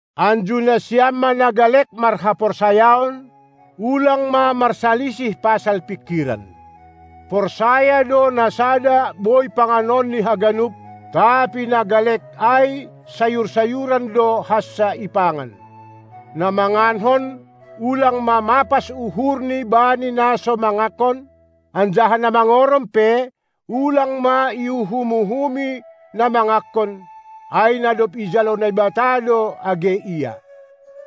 Anju nasiam ma na galek marhaporsayaon, ulang ma marsalisih pasal pingkiran. Porsaya do na sada boi panganonni haganup, tapi na galek ai sayur-sayuran do hansa ipangan. Na mangankon ulang ma mapas uhurni bani na so mangankon; anjaha na mangorom pe ulang ma iuhum-uhumi na mangankon, ai na dob ijalo Naibata do age ia.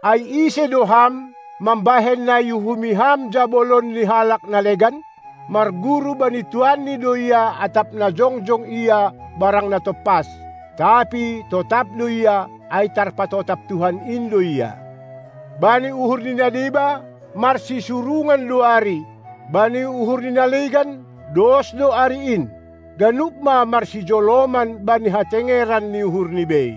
Ai ise do ham, mambahen na iuhumi ham jabolon ni halak na legan? Marguru bani tuanni do ia, atap na jongjong ia barang na tompas. Tapi totap do ia, ai tarpatotap Tuhan in do ia. Bani uhur ni na deba, marsisurungan do ari, bani uhur ni na legan, dos do ari in. Ganup ma marsijoloman bani hatengeran ni uhurni bei.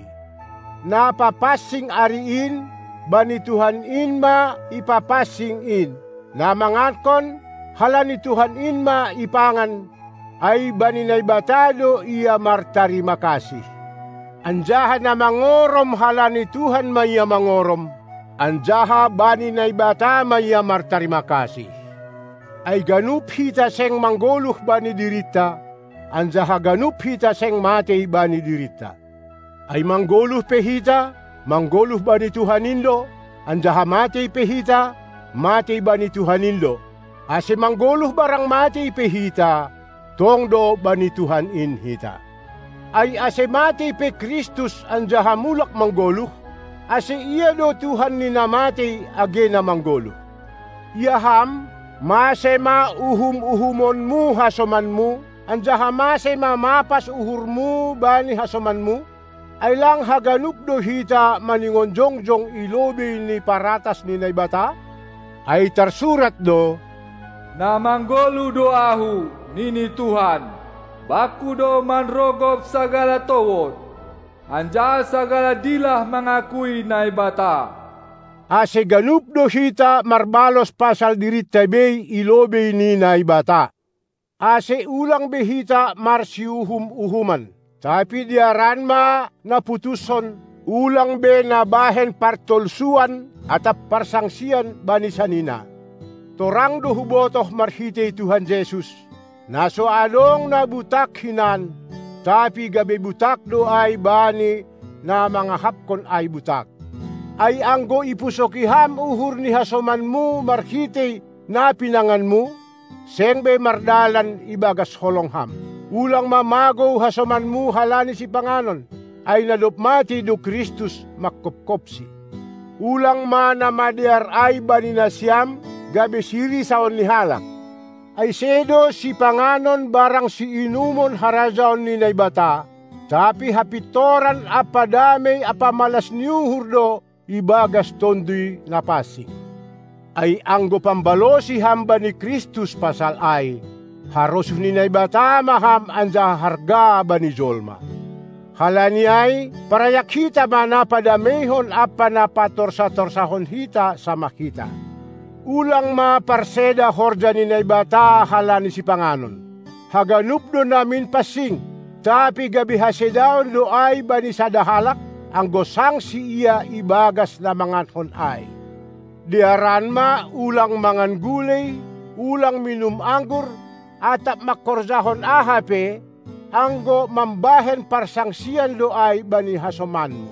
Na papansing ari in, bani Tuhan in ma ipapansing in: na mangankon, halani Tuhan in ma ipangan, ai bani Naibata do ia martarima kasih; anjaha na mangorom, halani Tuhan ma ia mangorom, anjaha bani Naibata ma ia martarima kasih. Ai ganup hita seng manggoluh bani dirinta, anjaha ganup hita seng matei bani dirinta. Ai manggoluh pe hita, manggoluh bani Tuhan in do, anjaha matei pe hita, matei bani Tuhan in do. Ase manggoluh barang matei pe hita, tong do bani Tuhan in hita. Ai ase matei pe Kristus anjaha mulak manggoluh, ase Ia do Tuhan ni na matei age na manggoluh. Ia ham, mase ma uhum-uhumonmu hasomanmu, anjaha mase ma mapas uhurmu bani hasomanmu? Ai lang haganup do hita maningon jongjong i lobei ni paratas ni Naibata? Ai tarsurat do: Na manggoluh do Ahu, nini Tuhan. Bangku do manrogop sagala towod, anjaha sagala dilah mangakui Naibata. Ase ganup do hita marbalos pasal dirinta bei i lobei ni Naibata. Ase ulang be hita marsiuhum-uhuman! Tapi dearan ma naputushon, ulang be nabahen partolsuan atap parsangsian bani sanina. Torang do hubotoh marhitei Tuhan Jesus, na so adong na butak hinan, tapi gabe butak do ai bani na mangahapkon ai butak. Ai anggo ipusoki ham uhur ni hasomanmu marhitei na pinanganmu, seng be mardalan ibagas holong ham. Ulang ma magou hasomanmu halani sipanganon, ai na dob matei do Kristus manghophopsi. Ulang ma na madear ai bani nasiam, gabe sirisaon ni halak. Ai sedo sipanganon barang siinumon harajaon ni Naibata, tapi hapintoran ampa damei ampa malas ni uhur do ibagas Tonduy Napansing. Ai anggo pambalosi ham bani Kristus pasal ai, harosuh ni Naibata ma ham anjaha harga bani jolma. Halani ai parayak hita ma na padameihon ampa na patorsa-torsahon hita samah hita! Ulang ma parseda horja ni Naibata halani sipanganon. Haganup do namin pansing, tapi gabe hasedaon do ai bani sada halak, anggo sangsi ia ibagas na mangankon ai. Dearan ma, ulang mangan gulei, ulang minum anggur, atap mangkorjahon aha pe, anggo mambahen parsangsian do ai bani hasomanmu.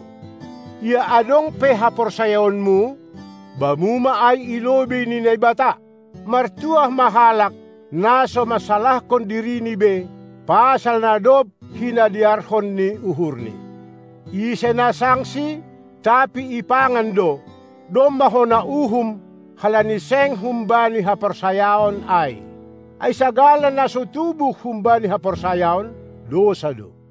Ia adong pe haporsayaonmu, bamu ma ai i lobei ni Naibata. Martuah ma halak, na so mansalahkon dirini be, pasal na dob hinadearhon ni uhurni. Ise na sangsi, tapi ipangan do, domma hona uhum, halani seng humbani haporsayaon ai. Ai sagala na so tubuh humbani haporsayaon, dousa do.